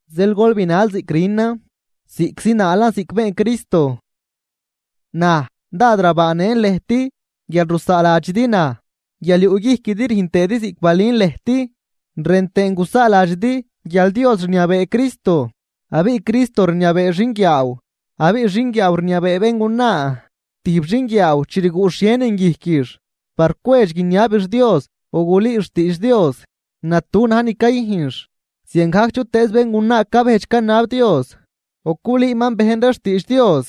Zeel gol binal ziꞌc rünan, ziꞌc zinaalan ziꞌc been Cristo. Naj dád rabaanëꞌn lëjt guial rusaaladxidi naj, guial yuꞌguijquidi rüjn tëëdi ziꞌc balün lëjt. Rën tëën gusaaladxidi guial Dios rniabee Cristo abiꞌ Cristo rniabee xinguiaaw abiꞌ xinguiaaw rniabee béngunaa. Tijb xinguiaaw chi rguꞌ xhienin guijquix par cwedx guiniabix Dios o gulüüx xtiidx Dios, natu na̱j ni cayüjnx. Ziangajc chutëëz béngunaa cabejdx canab Dios o culüüman bejn ree xtiidx Dios,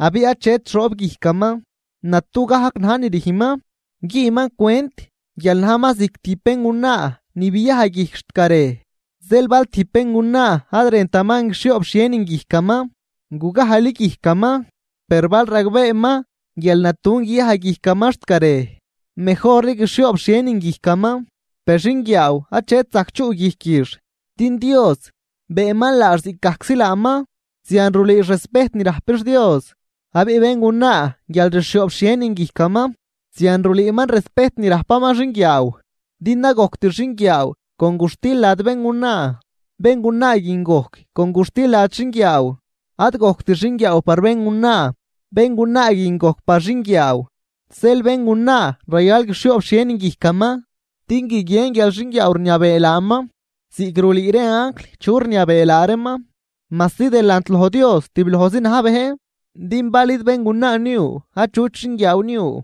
abiꞌ achet xoob guijcaman, natu gajc na̱j ni rüjnman. Güünman cwent guial najman ziꞌc tijb béngunaa ni biaj guijc xt garej. Zeel bal tijb béngunaa ad rëntaman guixhioob xhienin guijcaman, gugajli guijcaman. Per bal ragbeeman, guial natun guiyaj guijcaman xt garej, mejorli guixhioob xhienin guijcaman. Per xinguiaaw achet zajc chuꞌ guijquix din Dios beenman laax ziꞌcgajczi laaman, zian rulüüx respejt ni rajpix Dios. Abiꞌ béngunaa guial rxhioob xhienin guijcaman, zian rulüüman respejt ni rajpaman xinguiaaw. Din ad gojct xinguiaaw con guxtil lad béngunaa, béngunaa guin gojc con guxtil lad xinguiaaw. Ad gojct xinguiaaw par béngunaa, béngunaa guin gojc par xinguiaaw. Zeel béngunaa rayal guixhioob xhienin guijcaman din guiguien guial xinguiaaw rniabee laaman ziꞌc rulüü ree anjl chu rniabee laa reeman. Majsi delant loj Dios tiblojzi na̱j bejn, din bal id béngunaa niu achut xinguiaaw niu,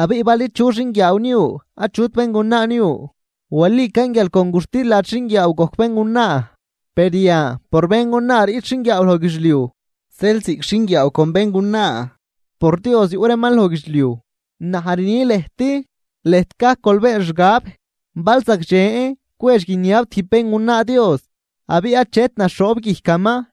abiꞌ bal id chu xinguiaaw niu achut béngunaa niu. Walican, guial con guxtil lad xinguiaaw gojc béngunaa, per yan por béngunaa riꞌt xinguiaaw loj guidxliuj, zeel ziꞌc xinguiaaw con béngunaa por Dios yuꞌ reeman loj guidxliuj. Naj rni lëjt, lëjt gajc gol been xgab bal zagdxen cwedx guiniab tijb béngunaa Dios abiꞌ achet naxhoob guijcaman.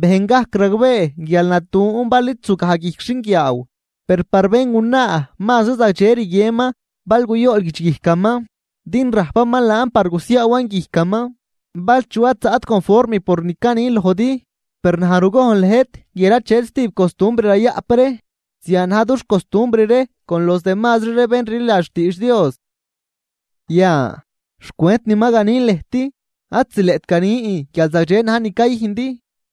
Bejn gajc ragbee guial natun bal id zugaj guijc xinguiaaw. Per par béngunaa mazri zagdxe rguienman bal guyool guidxguijcaman, din rajpaman laan par gusiaawan guijcaman. Bal chu ad zaꞌt conform por ni canin lojdi, per naj rugojn lëjt guial achet stijb costumbr rayaꞌp ree, zian na̱j dux costumbr ree con los demazri ree bén rliladx xtiidx Dios. Yan xcwent ni ma ganin lëjt, ad zileꞌt ganin guial zagdxe na̱j ni cayüjndi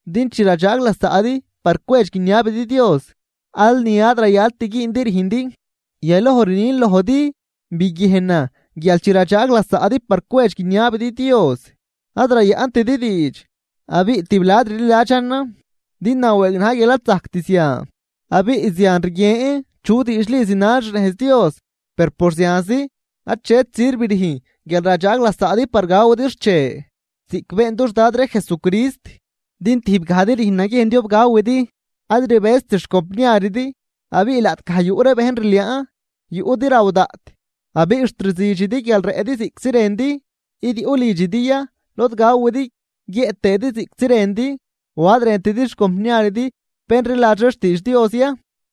din chi radxaag lasaꞌdi par cwedx guiniabidi Dios, al ni ad rayalt güündi rüjndi. Yaloj rnin lojdi biguiejnan guial chi radxaag lasaꞌdi par cwedx guiniabidi Dios ad rayaꞌntidi diidx, abiꞌ tiblad rliladxanan. Din nawëëg najn guial ad zajct zian, abiꞌ zian rguien chu diidxli zinal xnejz Dios. Per por zianzi, achetri sirv rüjn guial radxajg lasaꞌdi par gawidi xche ziꞌc been dux Dad ree Jesucrist. Din tijbgajdi rüjn naguiejn diob gawidi, ad rbëjzt xcompniaridi. Abiꞌ laꞌtgaj yuꞌ ree bejn rliaan, yuꞌdi raw daꞌt abiꞌ xt rzüdxidi guial rëꞌdi ziꞌctzi rëndi. ¿Id yuꞌ lidxidi ya lod gawidi guiëꞌ tëëdi ziꞌctzi rëndi?, ¿o ad rëntidi xcompniaridi bén rliladx ree xtiidx Dios ya,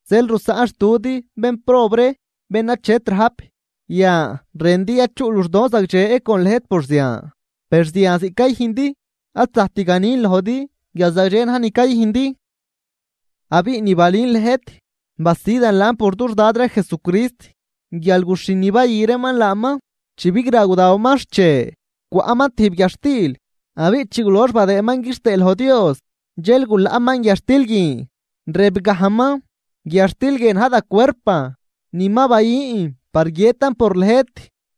zeel rusaꞌnxtudi bénprob ree bén achet rajp? Yan, ¿rëndi ya chuꞌ luxdon zagdxe con lëjt por zian? ¡Per zian ziꞌc cayüjndi, ad zajct ganin lojdi guial zagdxe na̱j ni cayüjndi! Abiꞌ ni balün lëjt, basidan laan por dux Dad ree Jesucrist guial guxhin ni bayü reeman laaman chi bigra gudawaman xche, cwaꞌman tijb guiadxtil. Abiꞌ chi gulox badëëman quixtëë loj Dios dxel gulaꞌman guiadxtil guin, rëb gajman: “Guiadxtil guie na̱j da cuerpan ni ma bayün par guiëtan por lëjt.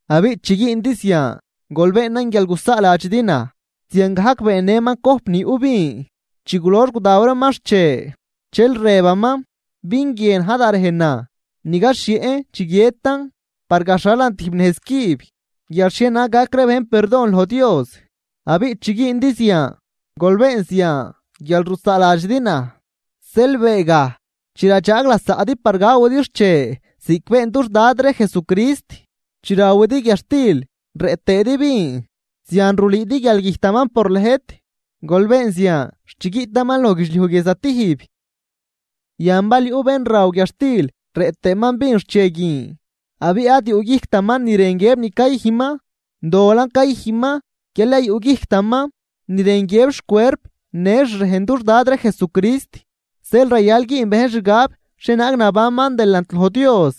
Abiꞌ chi güündi zian, gol beenan guial gusaaladxidi naj.” Ziangajc beennëman cojp ni yuꞌ vin chi gulox gudaw reeman xche, dxel rëbaman: “Vin guie na̱j da rejnan ni gaxhieꞌn chi guiëtan par gaxhalan tijb nejz cüb guial xhienaag gac ree bejn perdon loj Dios. Abiꞌ chi güündi zian, gol been zian guial rusaaladxidi naj.” Zeel, beegaj chi radxaag lasaꞌdi par gawidi xche ziꞌc been dux Dad ree Jesucrist, chi rawidi guiadxtil rëꞌ tëëdi vin, zian rulüüdi guial güjtaman por lëjt, gol been zian xt chi guiꞌtaman loj guidxliuj guie zatijb. Yan bal yuꞌ bén raw guiadxtil rëꞌ tëëman vin xche guin, abiꞌ ad yuꞌ guijctaman ni rën guiëb ni cayüjnman, dolan cayüjnman guial ad yuꞌguijctaman ni rën guiëb xcuerp në xrejn dux Dad ree Jesucrist. Zeel rayal güün bejn xgab xhienaag nabanman delant loj Dios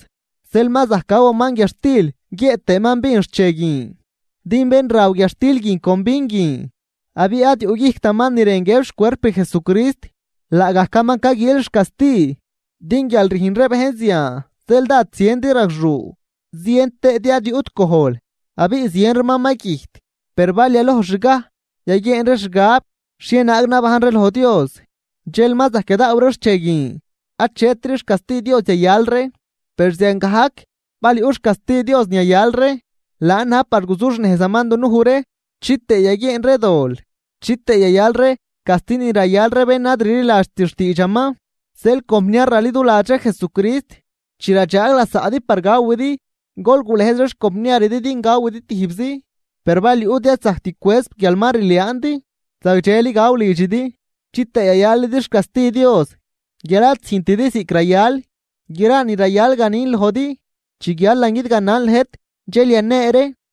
dxel ma zajc gawaman guiadxtil guiëꞌ tëëman vin xche guin. Din bén raw guiadxtil guin con vin guin abiꞌ ad yuꞌguijctaman ni rën guiëb xcuerp Jesucrist. Laagajcaman caguiil xcasti. Din guial rüjn ree bejn zian zeel dád ziendi ragxuu, zien tëëdi ad yuꞌt gojl abiꞌ zien reeman ma güjt. Per bal yalojxgaj yaguieen ree xgab xhienaag nabajn ree loj Dios dxel ma zajc yadaaw ree xche guin, achetri xcasti Dios yayal ree. Per ziangajc bal yuꞌ xcasti Dios ni yayal ree, laan na̱j par guzuxnejzaman dunuj ree chitëë yaguieen ree dol, chitëë yayal ree casti ni rayal ree bén ad rliladxt xtiidxaman. Zeel compniar raliduladx ree Jesucrist, chi radxaag lasaꞌdi par gawidi, gol gulëjz ree xcompniaridi din gawidi tijbzi. Per bal yuꞌdi ad zajct cwëz guial ma rliaandi, zagdxeli gaw lidxidi chitëë yayalidi xcasti Dios guial ad züjntidi ziꞌc rayal. Gra ni rayal ganin lojdi, chi guialan guidganan lëjt dxel yanee ree.